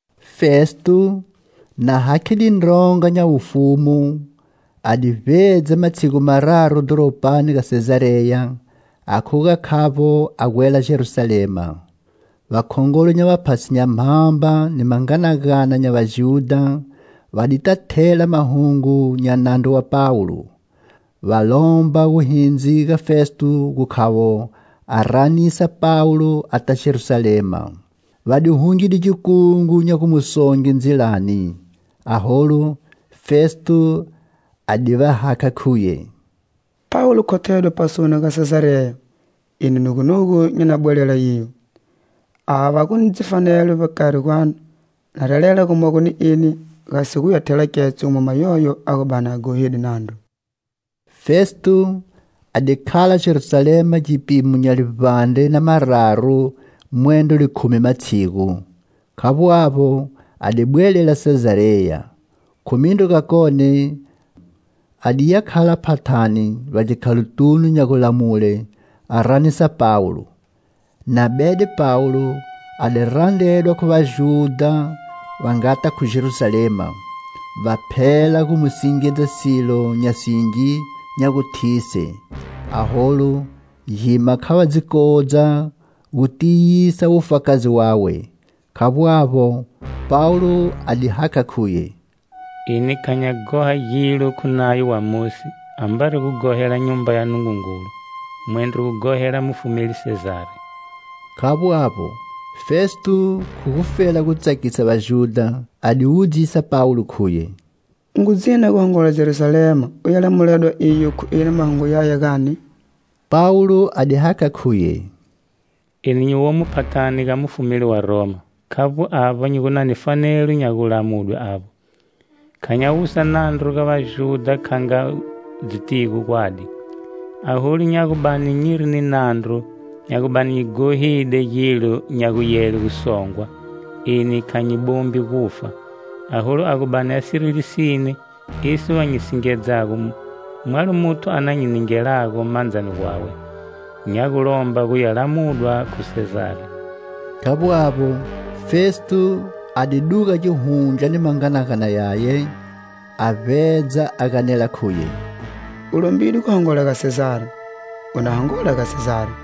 Festo, na hakhide ndronga nya wufumu, a di vbedza matshigu mararu dhoropani ga Sezareya, a khuga khavbo a gwela Jerusalema. Vakhongolo nya vaphasi nya mhamba ni manganagana nya Vajudha va dita thela mahungu nya nandru wa Pawulo, Va lomba wuhindzi ga Festo gu khavo a ranisa Pawulo ata Jerusalema; Va di hungide gikungu nya gu mu songe ndzilani. Aholu, Festo a di va hakha khuye: "Pawulo khothedwe pasoni ga Sezareya. Eni nugunugu nyi na bwelela iyo. Ava va gu ni dzifanelo vbakari gwanu va na relela gumogo ni eni, gasi guya thela ketso mwama yoyo a gu bani a ghohide nandru." Festo a di khala Jerusalema gipimo nya livbandre na mararu mwendro likhumi matshigu. Khavbo avbo, a di bwelela Sezareya. Khu mindru gakone a diya khala phathani vbagikhalotunu nya gulamule, a ranisa Pawulo. Na bede Pawulo, a di randredwa khu Vajudha va ngata khu Jerusalema, va phela gu mu singedza silo nya singi nya gu thise. Aholu gima kha va dzi kodza gu tiyisa wufakazi wawe. Khavbo avbo, Pawulo a di hakha khuye: "Eni kha nya ghoha gilo khu Nayo wa Mosi ambari gu ghohela Nyumba ya Nungungulu, mwendro gu ghohela mufumeli Sezari." Khavbo avbo, Festo khu gufela gu tsakisa Vajudha, a di wudzisa Pawulo khuye: "U ngu dzina gu hongola Jerusalema uya lamuledwa iyo khu eni mahungu yaya, gani?" Pawulo a di hakha khuye: "Eni nyi womo phathani ga mufumeli wa Roma. Khavbo avba nyi gu na ni fanelo nya gu lamuledwe avbo. Kha nya wusa nandru ga Vajudha kha nga u dzitigo gwadi. Aholu, nya gu bani nyiri ni nandru, nya gu bani nyi ghohide gilo nya guyele gu songwa, eni kha nyi bombi gufa. Aholu a gu bani a siri lisine esi va nyi singedzago, mwalo muthu a na nyi ningelago mandzani gwawe. Nya gu lomba gu ya lamudwa khu Sezari." Khavbo avbo, Festo a di duga gihundla ni manganagana yaye, a vbedza a ganela khuye: "U lombide gu hongola ga Sezari, u na hongola ga Sezari"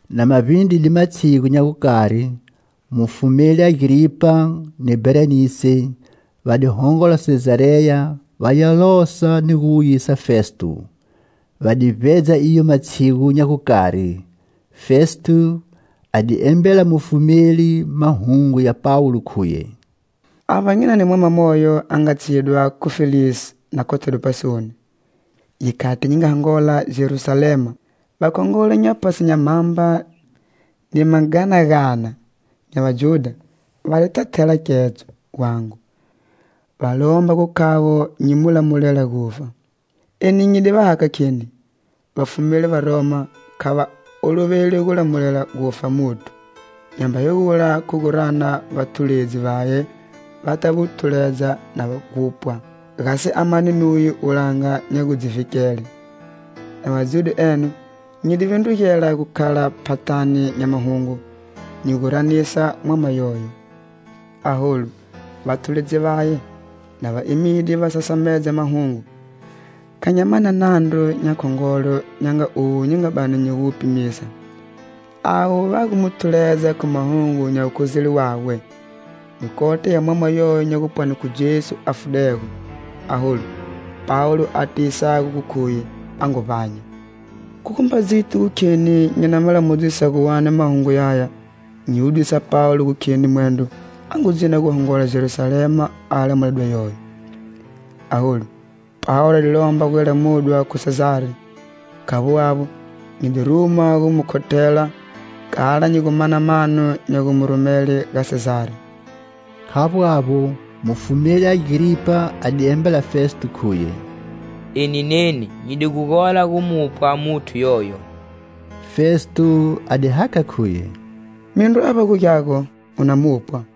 Na ma vbindride matshigu nya gukari, mufumeli Agripa ni Bherenise va di hongola Sezareya va ya losa ni gu wuyisa Festo. Va di vbedza iyo matshigu nya gukari. Festo a di embela mufumeli mahungu ya Pawulo, khuye: "Avba nyi na ni mwama moyo a nga tshidwa khu Felisi na khothedwe pasoni. Gikhati nyi nga hongola Jerusalema, vakhongolo nya vaphasi nya mhamba ni manganagana nya Vajudha va dita thela ketso gwangu, va lomba gu khavo nyi mu lamulela gufa. Eni nyi di va hakha kheni, vafumeli va Roma kha va oloveli gu lamulela gufa muthu, nyamba hegula khu gu rana vathuledzi vaye va ta mu thuledza na gupwa, gasi a mane nuye wulanga nya gu dzi vhikele. Na va dzude eno, nyi di vindrugela gukhala phathani nya mahungu, nyi gu ranisa mwama yoyo. Aholu vathuledzi vaye, na va emide va sasamedza mahungu, kha nya mana nandru nya khongolo, nya nga owu nyi nga bani nyi gu wu pimisa. Avo va gu mu thuledza khu mahungu nya wukhozeli wawe, ni kota ya mwama moyo nya gupwani khu Jesu a fudego, aholu Pawulo a tiyisago gu khuye a ngu vbanya. Khu gumba dziti gu kheni nyi na ma lamudzisa gu wani mahungu yaya, nyi di wudzisa Pawulo gu kheni mwendro a ngu dzina gu hongola Jerusalema a ya lamuledwa iyo. Aholu, Pawulo a di lomba guya lamudwa khu Sezari. Khavbo avbo, nyi di ruma gu mu khothela kala nyi gu mana mano nya gu mu rumele ga Sezari." Khavbo avbo, mufumeli Agripa a di embela Festo khuye: "Eni neni nyi di gu gola gu mupwa muthu yoyo." Festo a di hakha khuye: "Mindru avba gu gyago, u na mupwa."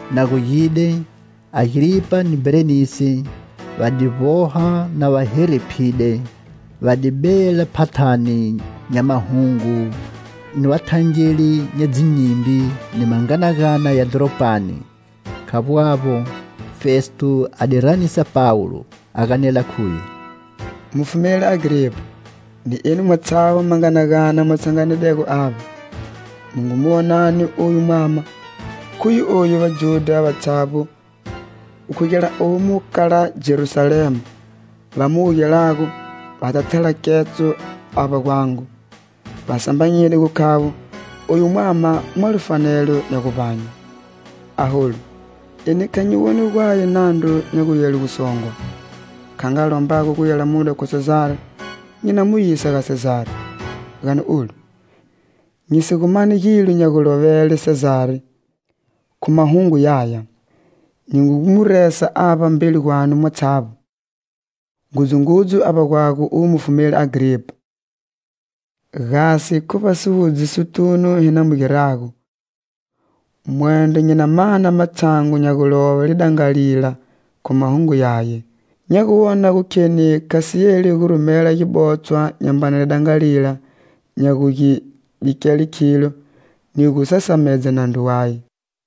Na gugide, Agripa ni Bherenise va di vboha na va herephide. Va di bela phathani nya mahungu ni vathangeli nya dzinyimbi ni manganagana ya dhoropani. Khavbo avbo, Festo a di ranisa Pawulo, a ganela khuye: "Mufumeli Agripa, ni enu mwatshavbo manganagana mu tshanganidego avba! Mu ngu mu wonani oyu mwama! Khuye oyu Vajudha vatshavbo, gu khugela omu kala Jerusalema va mu wugelago va ta thela katso avba gwangu. Va sambanyide gu khavo oyu mwama mwalo fanelo nya guvbanye. Aholu, eni kha nyi woni gwaye nandru nya guyele gu songwa. Kha nga a lombago guya lamudwa khu Sezari, nyi na mu yisa ga Sezari. Gani olu, nyi si gu mani gilo nya gulovele Sezari khu mahungu yaya. Nyi ngu mu resa avba mbeli gwanu mwatshavbo, ngudzungudzu avba gwago uwe mufumeli Agripa, gasi khu vbasiwudzisotunu hi na mu girago, mwendro nyi na mana matshangu nya gulove lidangalila khu mahungu yaye. Nya gu wona gu kheni kha si yeli gu rumela gibotshwa nyambana lidangalila nya gu gi bikele khilo ni gu sasamedza nandru waye."